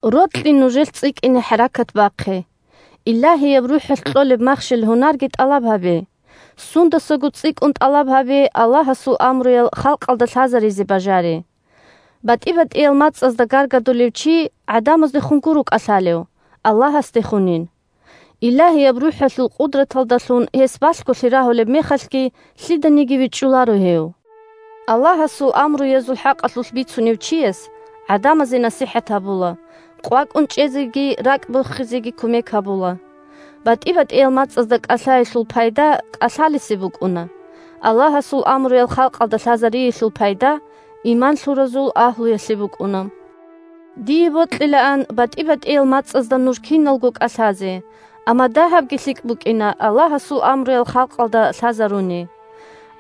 Рокьи нужелъ цӀикӀкӀине хӀаракат бахъе. Илагьияб РухӀалъ кьолеб махщел-гьунарги тӀалаб гьабе, сундасаго цӀикӀкӀун тӀалаб гьабе Аллагьасул амруял халкъалда лъазаризе бажари. БатӀи-батӀиял мацӀазда гаргадулев чи гӀадамаздехун гуро кӀалъалев, Аллагьасдехунин. Илагьияб РухӀалъул къудраталдалъун гьес балъголъи рагьулеб мехалъги, лъиданиги вичӀчӀуларо гьев. Аллагьасул амруязул хӀакъалъулъ бицунев чияс гӀадамазе насихӀат гьабула, къвакӀун чӀезеги ракӀ бохизеги кумек гьабула. БатӀи-батӀиял мацӀазда кӀалъаялъул пайда кӀалъалесе букӀуна, Аллагьасул амруял халкъалда лъазариялъул пайда иман лъуразул агьлуялъе букӀуна. Дие бокьилаан батӀи-батӀиял мацӀазда нуж киналго кӀалъазе, амма дагьабги лъикӀ букӀина Аллагьасул амруял халкъалда лъазаруни.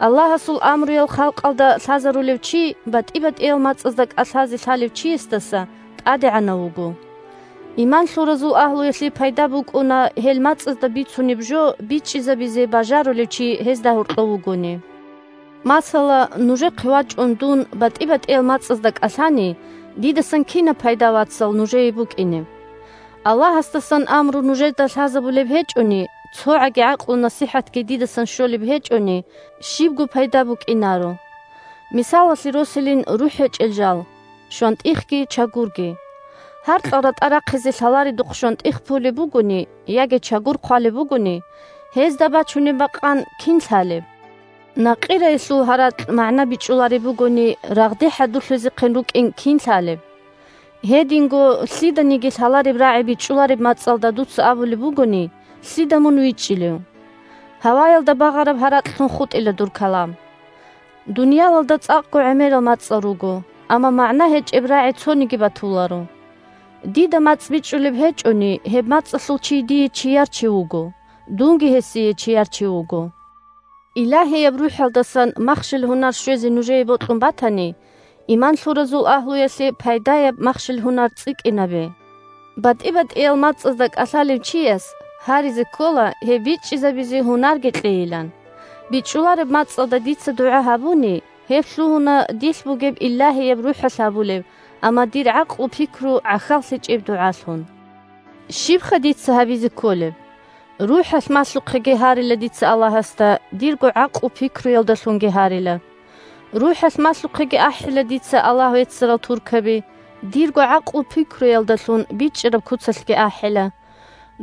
Аллагьасул амруял халкъалда лъазарулев чи батӀи-батӀиял мацӀазда кӀалъазе лъалев чиясдаса тӀадегӀанав вуго. Иман лъуразул агьлуялъе пайда букӀуна гьел мацӀазда бицунеб жо бичӀчӀизабизе бажарулев чи гьезда гьоркьов вугони. Масала, нужехъе вачӀун дун батӀи-батӀиял мацӀазда кӀалъани, дидасан кинаб пайда, вацал, нужее букӀинеб? Аллагьасдасан амру нужеда лъазабулеб гьечӀони, цогӀаги гӀакълу-насихӀатги дидасан щолеб гьечӀони, – щибго пайда букӀинаро. Мисалалъе росилин рухӀ гьечӀел жал – щвантӀихги чагурги. Гьаркьал ратӀа рахъизе лъаларедухъ щвантӀих пулеб бугони яги чагур хъвалеб бугони, гьезда бачунеб бакъан кин лъалеб? Накъираялъул гьаракь магӀна бичӀчӀулареб бугони, рагъде хӀадурлъизехъин рукӀин кин лъалеб? Гьединго, лъиданиги лъалареб рагӀи бичӀчӀулареб мацӀалда дуца абулеб бугони, лъида мун вичӀчӀилев? Гьаваялда багъараб гьаракьлъун хутӀила дур калам. Дуниялалда цӀакъго гӀемерал мацӀал руго, амма магӀна гьечӀеб рагӀи цониги батуларо. Дида мацӀ бичӀчӀулеб гьечӀони, гьеб мацӀалъул чи дие чияр чи вуго, дунги гьесие чияр чи вуго. Илагьияб РухӀалдасан махщел-гьунар щвезе нужее бокьун батани, иман лъуразул агьлуялъе пайдаяб махщел-гьунар цӀикӀкӀинабе. БатӀи-батӀиял мацӀазда кӀалъалев чияс гьаризе ккола гьеб бичӀчӀизабизе гьунарги кьейилан. БичӀчӀулареб мацӀалда дица дугӀа гьабуни, – гьеб лъугьуна дилъ бугеб Илагьияб РухӀалъ гьабулеб, амма дир гӀакълу-пикру гӀахьаллъичӀеб дугӀалъун. Щибха дица гьабизе кколеб? РухӀалъ малъухъеги гьарила дица Аллагьасда, дирго гӀакълу-пикруялдалъунги гьарила. РухӀалъ малъухъеги ахӀила дица Аллагь веццарал туркаби, дирго гӀакълу-пикруялдалъун бичӀчӀараб куцалъги ахӀила.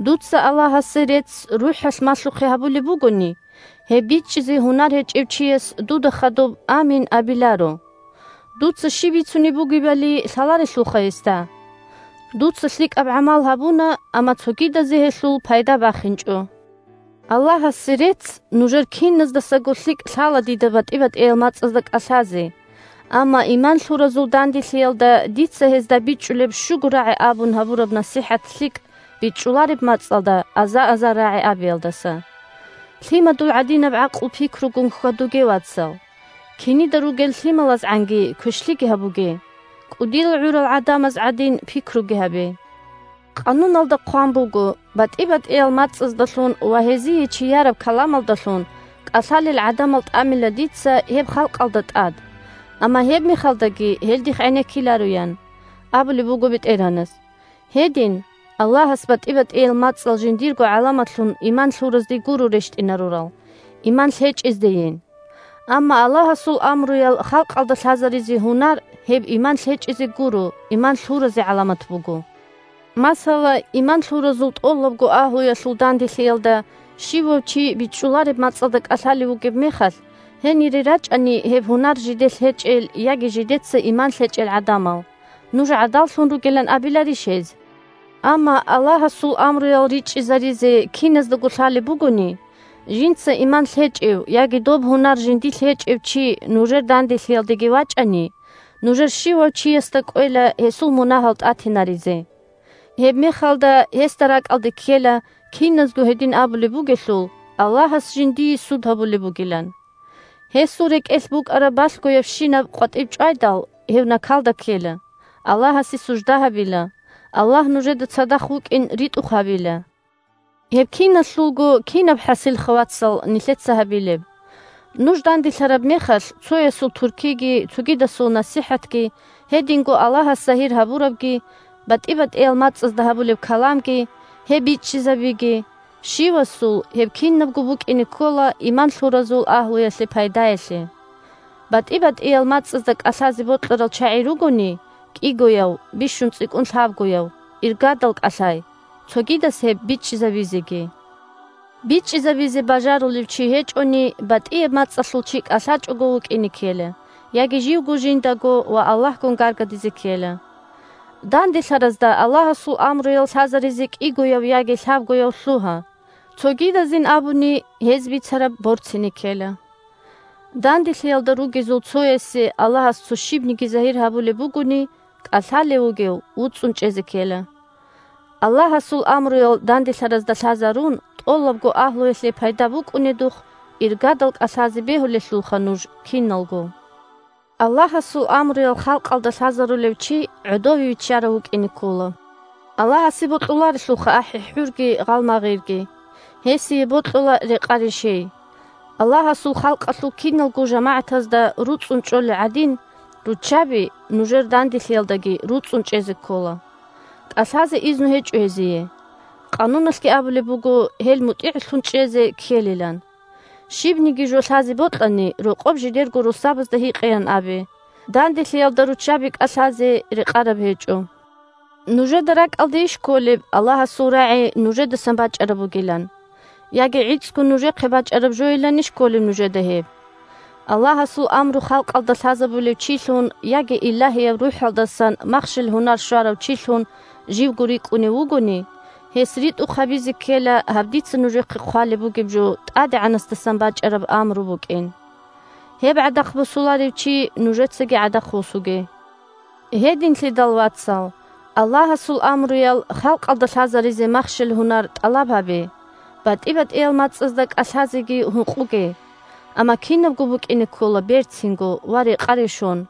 Дуца Аллагьасе рецц РухӀалъ малъухъе гьабулеб бугони, гьеб бичӀчӀизе гьунар гьечӀев чияс дуда хадуб «Амин» абиларо. Дуца щиб бицунеб бугебали лъаларелъулха гьесда. Дуца лъикӀаб гӀамал гьабуна, амма цогидазе гьелъул пайда бахинчӀо. Аллагьасе рецц, нужер киназдасаго лъикӀ лъала дида батӀи-батӀиял мацӀазда кӀалъазе, амма иман лъуразул данделъиялда дица гьезда бичӀчӀулеб щуго рагӀи абун гьабураб насихӀат лъикӀ, бичӀчӀулареб мацӀалда аза-азар рагӀи абиялдаса. Лъимадул гӀадинаб гӀакълу-пикругун хьвадуге, вацал. Кинида ругел лъималазгӀанги квешлъиги гьабуге, кӀудиял гӀурал гӀадамаз гӀадин пикруги гьабе. Къануналда хъван буго: «БатӀи-батӀиял мацӀаздалъун ва гьезие чияраб каламалдалъун кӀалъалел гӀадамал тӀамила дица гьеб халкъалда тӀад, амма гьебмехалдаги гьел дихъ гӀенеккиларо», – ян абулеб буго БетӀергьанас. Гьедин, Аллагьас батӀи-батӀиял мацӀал жиндирго гӀаламатлъун иман лъуразде гуро рещтӀинарурал, иман лъечӀездейин. Амма Аллагьасул амруял халкъалда лъазаризе гьунар – гьеб иман лъечӀезе гуро, иман лъуразе гӀаламат буго. Масала, иман лъуразул тӀолабго агьлуялъул данделъиялда щивав чи бичӀчӀулареб мацӀалда кӀалъалев вугеб мехалъ, гьенире рачӀани гьеб гьунар жиделъ гьечӀел яги жидеца иман лъечӀел гӀадамал, нуж гӀадаллъун ругилан абиларищ гьез? Амма Аллагьасул амруял ричӀчӀизаризе киназдаго лъалеб бугони, жинца иман лъечӀев яги доб гьунар жиндилъ гьечӀев чи нужер данделъиялдеги вачӀани, нужер щивав чиясда кӀвела гьесул мунагьал тӀатинаризе. Гьебмехалда гьесда ракӀалде ккела, киназго гьедин абулеб бугелъул, Аллагьас жиндие суд гьабулеб бугилан. Гьесул рекӀелъ букӀараб балъгоябщинаб къватӀиб чӀвайдал, гьев накалда ккела, Аллагьасе сужда гьабила, Аллагь нужеда цадахъ вукӀин ритӀухъ гьабила. Гьеб киналъулго кинаб хӀасилха, вацал, нилъеца гьабилеб? Нуж данделъараб мехалъ, цоясул туркиги, цогидасул насихӀатги, гьединго Аллагьас загьир гьабурабги, батӀи-батӀиял мацӀазда гьабулеб каламги, гьеб бичӀчӀизабиги – щивасул гьеб кинабго букӀине ккола иман лъуразул агьлуялъе пайдаялъе. БатӀи-батӀиял мацӀазда кӀалъазе бокьарал чагӀи ругони, кӀигояв, бищун цӀикӀкӀун лъабгояв, иргадал кӀалъай, цогидас гьеб бичӀчӀизабизеги. БичӀчӀизабизе бажарулев чи гьечӀони, батӀияб мацӀалъул чи кӀалъачӀого вукӀине ккела яги живго жиндаго ва Аллагьгун гаргадизе ккела. Данделъаразда Аллагьасул амруял лъазаризе кӀигояв яги лъабгояв лъугьа, цогидазин абуни, гьез бицараб борцине ккела. Данделъиялда ругезул цоясе Аллагьас цо щибниги загьир гьабулеб бугони, кӀалъалев вугев вуцӀцӀун чӀезе ккела. Аллагьасул амруял данделъаразда лъазарун, тӀолабго агьлуялъе пайда букӀунедухъ, иргадал кӀалъазе бегьулелъулха нуж киналго. Аллагьасул амруял халкъалда лъазарулев чи гӀодове виччарав вукӀине ккола. Аллагьасе бокьуларелъулха ахӀи-хӀурги гъалмагъирги. Гьесие бокьула рекъа-решей. Аллагьасул халкъалъул киналго жамагӀатазда руцӀцӀун чӀолел гӀадин, руччаби нужер данделъиялдаги руцӀцӀун чӀезе ккола. КӀалъазе изну гьечӀо гьезие. Къануналъги абулеб буго гьел мутӀигӀлъун чӀезе ккелилан. Щибниги жо лъазе бокьани, рокъоб жидерго росабазда гьикъеян абе. Данделъиялда руччаби кӀалъазе рекъараб гьечӀо. Нужеда ракӀалдейищ кколеб Аллагьасул рагӀи нужедасан бачӀараб бугилан? Яги гӀицӀго нужехъе бачӀараб жойиланищ кколеб нужеда гьеб? Аллагьасул амру халкъалда лъазабулев чилъун яги Илагьияб РухӀалдасан махщел-гьунар щварав чилъун живго рикӀкӀунев вугони, гьес ритӀухъ гьабизе ккела гьаб дица нужехъе хъвалеб бугеб жо ТӀадегӀанасдасан бачӀараб амру букӀин. Гьеб гӀадахъ босуларев чи нужецаги гӀадахъ восуге. Гьединлъидал, вацал, Аллагьасул амруял халкъалда лъазаризе махщел-гьунар тӀалаб гьабе, батӀи-батӀиял мацӀазда кӀалъазеги гьукъуге. Амма кинабго букӀине ккола берцинго ва рекъа-решон.